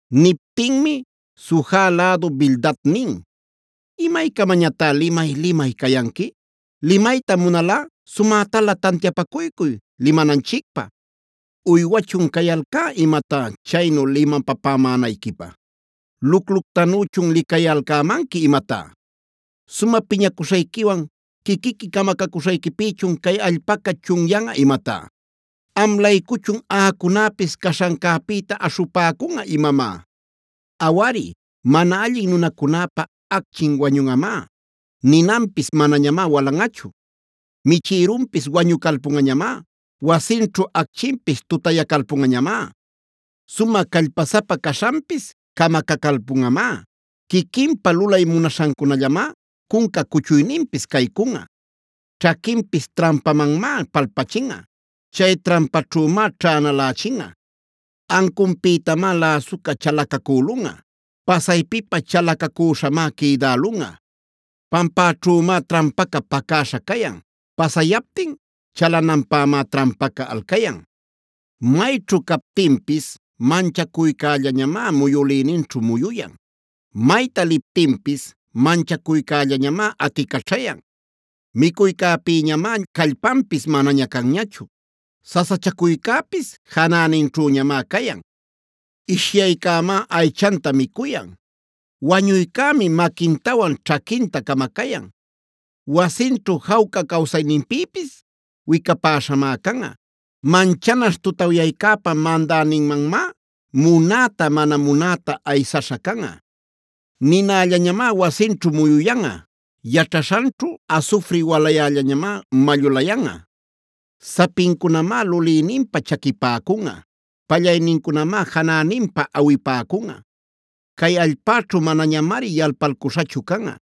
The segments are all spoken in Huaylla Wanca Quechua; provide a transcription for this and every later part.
Niptinmi Suja lädu Bildad nin: “¿Imaycamañatá limay-limay cayanqui? Limayta munalꞌa, sumätalä tantiapacuycuy limananchicpä. ¿Uywachun cayalcá imatá chaynu limapapämänayquipä? ¿Lucluctanüchun licayalcämanqui imatá? ¿¡Sumä piñacuśhayquiwan quiquiqui camacacuśhayquipïchun cay allpaca chunyanꞌa imatá!? ¿Am-laycuchun, aꞌacunäpis caśhancäpïta aśhupäcunꞌa imamá? “Awari, mana allin nunacunäpa acchin wañunꞌamá; ninanpis manañamá walanꞌachu. Michïrunpis wañucalpunꞌañamá; wasinćhu acchinpis tutayacalpunꞌañamá. Sumä callpasapa caśhanpis camacacalpunꞌamá; quiquinpa lulay munaśhancunällamá cunca cuchuyninpis caycunꞌa. Ćhaquinpis trampamanmá palpachinꞌa; chay trampaćhümá ćhänalächinꞌa. Ancunpïtamá läsuca chalacacülunꞌa; pasaypipä chalacacüśhamá quïdälunꞌa. Pampäćhümá trampaca pacäśha cayan; pasayaptin chalananpämá trampaca alcayan. “Mayćhu captinpis manchacuycällañamá muyülïninćhu muyuyan; mayta liptinpis manchacuycällañamá aticaćhayan. Micuycäpïñamá callpanpis manaña canñachu; sasachacuycäpis janäninćhüñamá cayan. Ishyaycämá aychanta micuyan; wañuycämi maquintawan ćhaquinta camacayan. Wasinćhu jawca cawsayninpïpis wicapäśhamá canꞌa; manchanaśh tutawyäcäpa mandäninmanmá munäta mana munäta aysaśha canꞌa. Ninallañamá wasinćhu muyuyanꞌa; yaćhaśhanćhu asufri walayällañamá mallulayanꞌa. Sapincunamá lulïninpa chaquipäcunꞌa; pallaynincunamá janäninpa awipäcunꞌa. Cay allpäćhu manañamari yalpalcuśhachu canꞌa;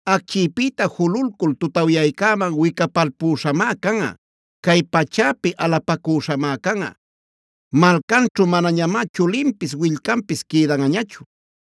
Acchïpïta jululcul tutawyaycäman wicapalpüśhamá canꞌa; cay pachäpi alapacüśhamá canꞌa. Malcanćhu manañamá chulinpis, willcanpis quïdanꞌañachu;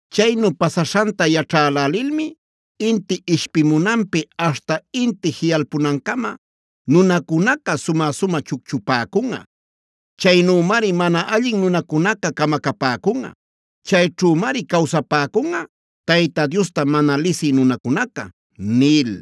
Chaynu pasaśhanta yaćhälälilmi inti ishpimunanpi aśhta inti jiꞌalpunancama nunacunaca sumä-sumä chucchupäcunꞌa. Chaynümari mana allin nunacunaca camacapäcunꞌa; chayćhümari cawsapäcunꞌa Tayta Diosta mana lisï nunacunaca” nil.